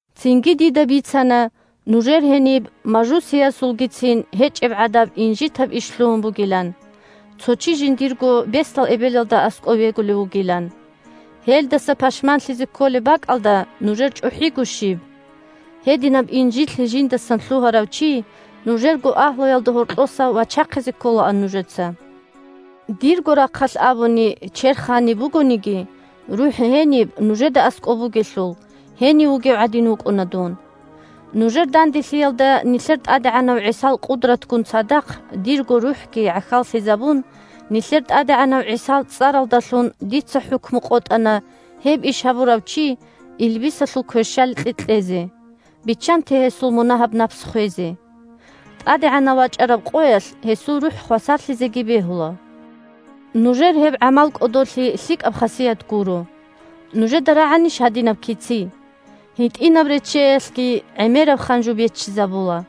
Цинги, дида бицана нужер гьениб мажусиязулгицин гьечӀебгӀадаб инжитаб иш лъугьун бугилан – цо чи жиндирго бесдал эбелалда аскӀов вегулев вугилан. Гьелдаса пашманлъизе кколеб бакӀалда нужер чӀухӀиго щиб! Гьединаб инжитлъи жиндасан лъугьарав чи нужерго агьлуялда гьоркьоса вачахъизе кколаан нужеца. Дирго рахъалъ абуни, черх гьаниб бугониги, рухӀ гьениб нужеда аскӀоб бугелъул, гьенив вугев гӀадин вукӀуна дун. Нужер данделъиялда нилъер ТӀадегӀанав ГӀисал къудратгун цадахъ дирго рухӀги гӀахьаллъизабун, нилъер ТӀадегӀанав ГӀисал цӀаралдалъун дица хӀукму къотӀана гьеб иш гьабурав чи илбисалъул кверщаликье кьезе – биччанте гьесул мунагьаб напс хвезе. ТӀадегӀанав вачӀараб къоялъ гьесул рухӀ хвасарлъизеги бегьула. Нужер гьеб гӀамал кӀодолъи лъикӀаб хасият гуро. Нужеда рагӀанищ гьадинаб кици: «ГьитӀинаб реччеялъги гӀемераб ханжу беччизабула»?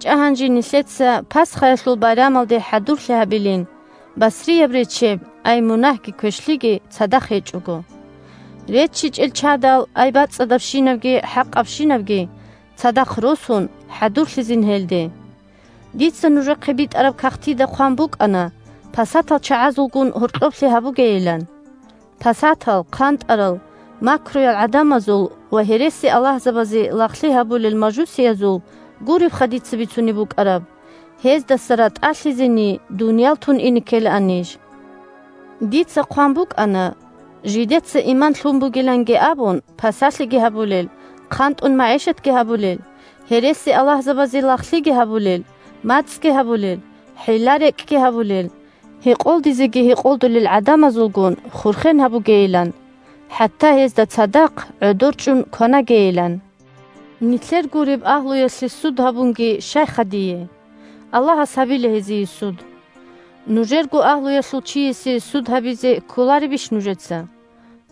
РачӀа гьанже нилъеца пасхаялъул байрамалде хӀадурлъи гьабилин басрияб речче (ай мунагьги квешлъиги) цадахъ гьечӀого. РеччичӀел чадал (ай бацӀцӀадабщинабги хӀакъабщинабги) цадахъ, росун хӀадурлъизин гьелде. Дица нужехъе битӀараб кагътида хъван букӀана пасатал чагӀазулгун гьоркьоблъи гьабугейилан. Пасатал, хъантӀарал, макруял гӀадамазул ва гьересиаллагьзабазе лагълъи гьабулел мажусиязул гуребха дица бицунеб букӀараб. Гьездаса ратӀалъизени, дуниял тун ине ккелаан ниж. Дица хъван букӀана, жидеца иман лъун бугиланги абун, пасалъиги гьабулел, хъантӀун магӀишатги гьабулел, гьересиаллагьзабазе лагълъиги гьабулел, мацӀги гьабулел, хӀилла-рекӀкӀги гьабулел, гьекъолдизеги гьекъолдулел гӀадамазулгун хурхен гьабугейилан, хӀатта гьезда цадахъ гӀодор чӀун кванагейилан. Нилъер гуреб агьлуялъе суд гьабунги щайха дие? Аллагьас гьабила гьезие суд. Нужерго агьлуялъул чиясе суд гьабизе кколаребищ нужеца?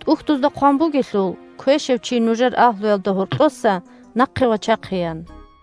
ТӀухьдузда хъван бугелъул: «Квешав чи нужер агьлуялда гьоркьоса нахъе вачахъе», – ян.